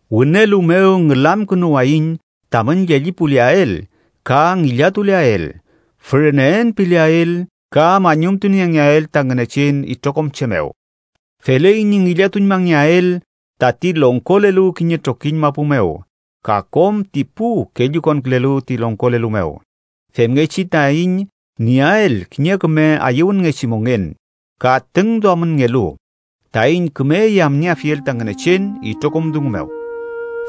Wünelu mew ngülamkünuwayiñ tamün llellipuleael ka ngillatuleael, füreneen pileael ka mañumtuniengeael ta Ngünechen itrokom che mew. Feley ñi ngillatuñmangeael tati longkolelu kiñe trokiñ mapu mew ka kom ti pu kellukonkülelu ti longkolelu mew, femngechi taiñ nieael kiñe küme ayüwünngechi mongen ka tüngduamünngelu taiñ küme yamnieafiel ta Ngünechen itrokom dungu mew.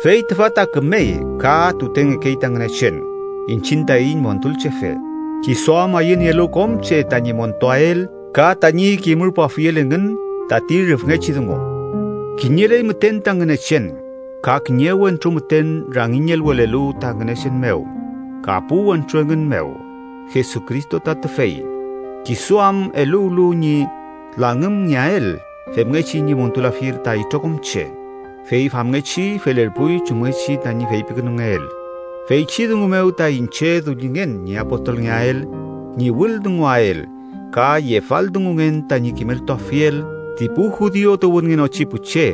Fey tüfa ta kümey ka tutengekey ta Ngünechen iñchiñ taiñ Montulchefe, kisu am ayünielu kom che tañi montuael ka tañi kimürpuafiel engün tati rüfngechi dungu. Kiñeley müten ta Ngünechen ka kiñe wentru müten rangiñelwelelu ta Ngünechen mew ka pu wentru engün mew: Jesucristo ta tüfey, kisu am eluwlu ñi langümngeael femngechi ñi montulafiel ta itrokom che, fey famngechi felerpuy chumngechi tañi feypikünungeel. Feychi dungu mew ta iñche dullingen ñi apostolngeael ñi wüldunguael, ka yefaldungungen tañi kimeltuafiel ti pu judiu tuwünngenochi pu che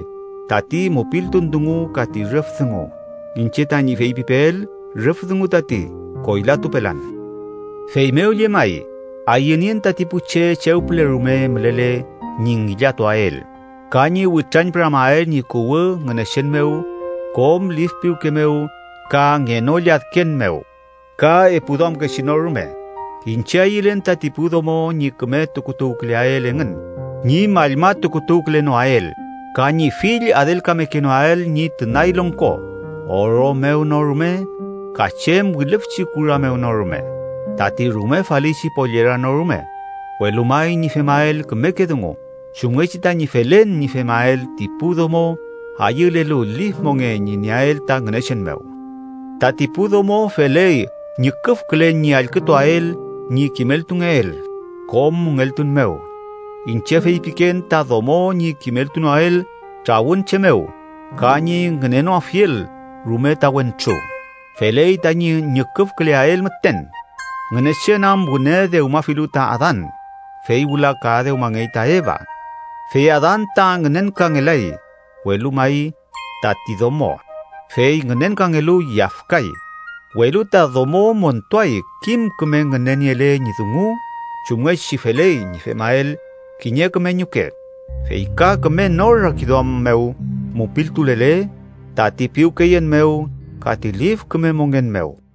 tati mupiltun dungu ka ti rüf dungu. Iñche tañi feypipeel rüf dungu tati. Koylatupelan. Feymew llemay, ayünien tati pu che chew püle rume mülele ñi ngillatuael, ka ñi witrañpüramael ñi kuwü Ngünechen mew kom lif piwke mew ka ngenolladken mew ka epu duamkechi no rume. Iñche ayülen tati pu domo ñi küme tukutuwküleael engün ñi mallmatukutuwkülenoael ka ñi fill adelkamekenoael ñi tünay longko, oro mew no rume, ka chem wilüfchi kura mew no rume tati rume falichi pollera no rume, welu may ñi femael kümeke dungu, chumngechi tañi felen ñi femael ti pu domo ayülelu lif mongen ñi nieael ta Ngünechen mew. Tati pu domo feley ñüküfkülen ñi allkütuael ñi kimeltungeel, kom müngeltun mew. Iñche feypiken ta domo ñi kimeltunoael trawün che mew ka ñi ngünenoafiel rume ta wentru. Feley tañi ñüküfküleael müten Ngünechen am wüne dewmafilu ta Adan, fey wüla ka dewmangey ta Eva. Fey Adan ta ngünenkangelay, welu may tati domo. Fey ngünenkangelu, yafkay. Welu ta domo montuay kim küme ngüneniele ñi dungu chumngechi feley ñi femael kiñe küme ñuke, fey ka küme nor rakiduam mew mupiltulele, tati piwkeyen mew ka ti lif küme mongen mew.